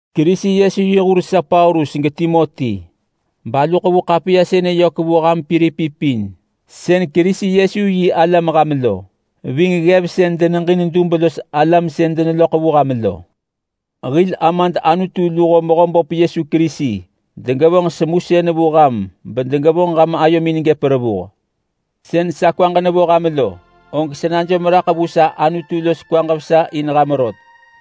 Kerisi Yesu yi hur sa Paulus geTimoti, balu ḳevu ḳapiya sënë yök vu ham Pilipi pin sën Kerisi Yesu yi alam ham lo, ving ggev sën deneġin dub los alam sën deneloḳ vu ham lo. Hil Amad Anutu luho Mehöböp Yesu Kerisi degevonġ semusën vu ham bedegevonġ ham ayomin gëp revuh. Sën sa kwaġ nevo ham lo, og sa najom raḳ vu sa Anutu los kwaġ vesa in ham rot.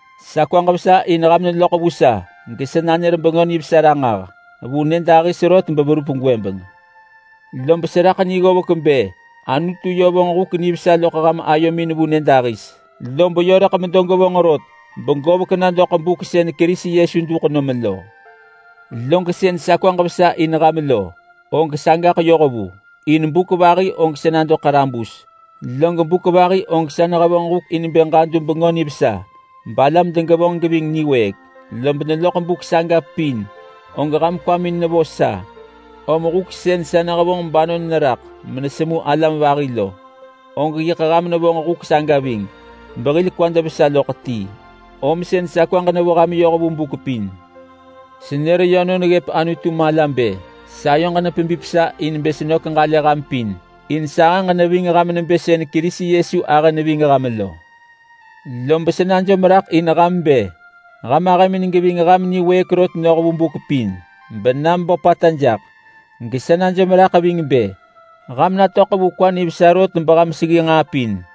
Sa kwaġ vesa in ham neloḳ vu sa gesa nanër Bengö Nivesa ranġah. Vu nyëdahis rot beverup gwëbeng. Lob seraḳ ni ggovek bë Anutu yö vonġ huk nivesa loḳ ham ayomin vu nyë dahis, lob yö rëḳ medo gevonġ rot begovek na doḳ buk sën Kerisi Yesu duḳ nom lo. Log sën sa kwaġ vesa in ham lo, og sagaḳ yoh vu. In buk vahi og sa nado ḳarabus, log buk vahi og sa nehevonġ huk in bë ġadu Bengö Nivesa balam degevonġ geving niwëëk. Lob neloḳ buk saga pin, og ham kwamin nevo sa, om huk sën sa nehevonġ banon neraḳ menesemu alam vahi lo, og yiḳ ham nevonġ huk sagi ving behil kwad vesa loḳ ti, om sën sa kwaġ nevo ham yoh vu buk pin. Senër yönon neggëp Anutu mala bë sayoġ nepebip sa in bë senök ġalë ham pin, in sahëġ neving ham nebë sën Kerisi Yesu ahë neving ham lo. Lob sa najom raḳ in ham bë ham ahëmin geving ham niwëëk rot noh vu buk pin bena meböpata jaḳ. Gesa najom raḳ ving bë ham natöḳ vu kwa nivesa rot beham seggi nġaa pin,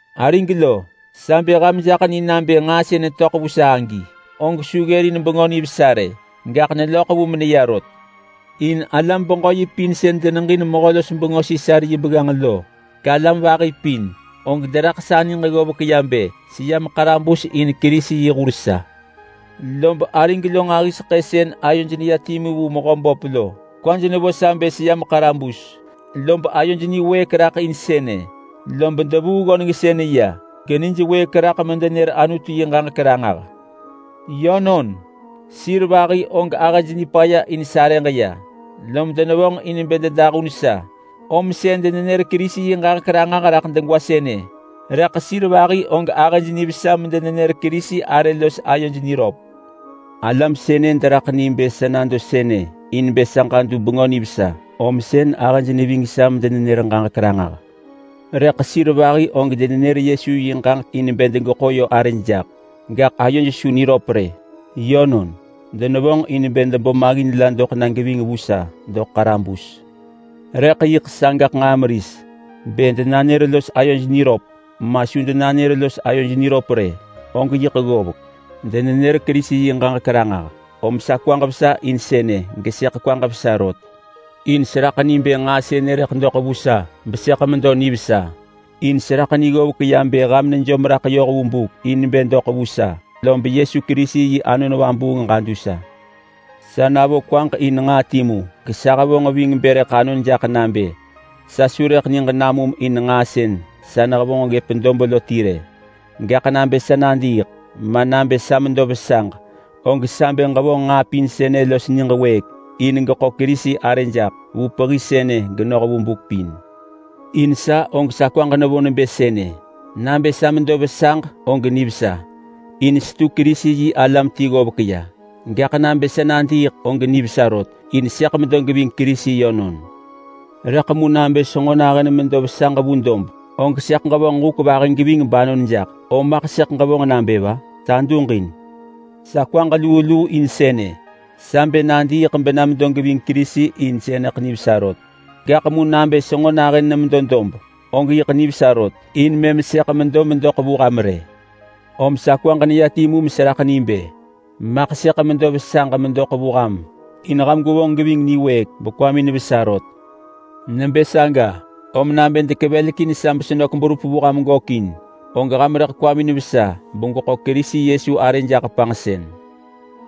Arig lo, sa bë ham jaḳ ni nabë nġaa sën töḳ vu sa agi, og su ggërin Bengö Nivesa rë. Gaḳ neloḳ vu meneya rot. In alam-beġö-yi pin sën deneġin mehö-los-bengö Sisar yi begganġ lo, galam vahi pin, og deraḳ sa niġ ggovek ya bë seyam ḳarabus in Kerisi yi hur sa. Lob arig lo nġahiseḳë sën ayoj neya timu vu Mehöböp lo kwaj nevo sa bë seyam ḳarabus, lob ayoj niwëëk raḳ in sënë, lob devuu ggönengsën ya genij wëëk raḳ medenër Anutu yi ġaġek ranġah. Yönon, sir vahi og ahëj nipaya in sarëġ ya, lob denevonġ in bë dedahun sa, om sën denenër Kerisi yi ġaġek ranġah raḳ degwa sënë, rëḳ sir vahi og ahëj nivesa medenenër Kerisi arë los ayoj niröp. Alam sënë deraḳ ni bë sa nado sënë in bë sa ġadu Bengö Nivesa, om sën ahëj neving sa medenenër ġaġek ranġah. Rëḳ sir vahi og denenër Yesu yi ġaġek in bë degeḳo yö arëj jaḳ. Gaḳ ayoj su niröp rë. Yönon, denevonġ in bë debo maggin la doḳ na geving vu sa doḳ ḳarabus. Rëḳ yiḳ sagaḳ nġaa meris. Bë denanër los ayoj niröp, ma su denanër los ayoj niröp rë, og yiḳ ggovek. Denenër Kerisi yi ġaġek ranġah, om sa kwaġ vesa in sënë, gesëḳ kwaġ vesa rot. In seraḳ ni bë nġaa sënë rëḳ doḳ vu sa besëḳ medo nivesa, in seraḳ ni ggovek ya bë ham nejom raḳ yoh vu buk in bë doḳ vu sa, lob Yesu Kerisi yi Anon Vabuung ġadu sa. Sa navo kwaġ in nġaa timu, gesa hevonġ ving bë rëḳ anon jaḳ nabë: Sa su rëḳ niġ namum in nġaa sën sa nehevonġ ggëp dob lo ti rë. Gaḳ nabë sa nadiiḳ, ma nabë sa medo vesaġ, og sa bë ġevonġ nġaa pin sënë los niġ wëëk in geḳo Kerisi arë jaḳ. Vu pehi sënë, genoh vu buk pin. In sa og sa kwaġ nevo nebë sënë: Nabë sa medo vesaġ og nivesa, in setu Kerisi-yi-alam ti ggovek ya. Gaḳ nabë sa nadiiḳ og nivesa rot, in sëḳ medo geving Kerisi yönon. Rëḳ mu nabë senġo nahën medo vesaġ vu dob, og sëḳ ġevonġ huk vahi geving banon jaḳ, om maḳ sëḳ ġevonġ nabë va? Sa duġin! Sa kwaġ luu luu in sënë. Sa bë nadiiḳ bena medo geving Kerisi in sënëḳ nivesa rot. Gaḳ mu nabë senġo nahën nemedo dob, og yiḳ nivesa rot, in mëm sëḳ medo medoḳ vu ham rë. Om sa kwaġ neya timu meseraḳ ni bë maḳ sëḳ medo vesaġ medoḳ vu ham in ham gwevonġ geving niwëëk bekwamin vesa rot. Nebë saga, om nabë dekevelekin sa besenök berup vu ham gökin, og ham rëḳ kwamin vesa in begweḳo Kerisi Yesu arë jaḳ panġsën.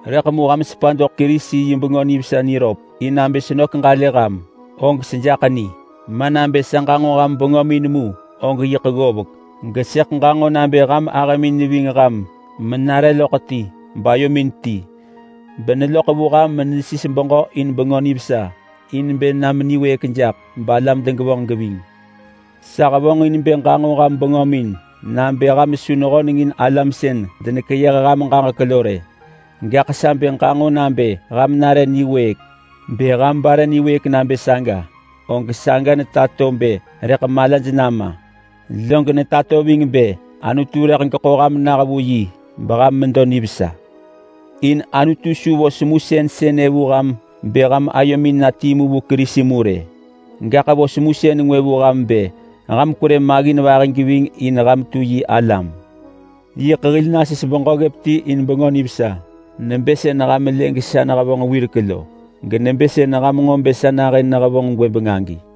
Rëḳ mu ham sepa doḳ Kerisi yi Bengö Nivesa niröp in nabë senök ġalë ham, og sejaḳ ni. Ma nabë sa ġanġo ham bengömin mu, og yiḳ ggovek, gesëḳ ġanġo nabë ham ahëmin neving ham menare loḳ ti, bayomin ti, beneloḳ vu ham menesis beġö in Bengö Nivesa in bë na meniwëëk jaḳ balam degevonġ geving. Sa hevonġin bë ġanġo ham bengömin nabë ham su nehönengin alam sën denekeyëh ham ġaġek lo rë. Gaḳ sa bë ġanġo nabë ham nare niwëëk. Bë ham bare niwëëk nabë saga, og saga netato bë rëḳ malaj nama. Log netato ving bë Anutu rëḳ geḳo ham nah vu yi beham medo nivesa. In Anutu su vo semusën sënë vu ham bë ham ayomin na timu vu Kerisi mu rë, gaḳ vo semusën ngwë vu ham bë kwerë maggin vahi geving in ham tu yi alam. Yiḳ hil nasis beġö ggëp ti in Bengö Nivesa, nebë sën ham lë gesa nehevonġ wirek lo, genebë sën ham nġo bë sa nahën nehevonġ gwëbeng agi.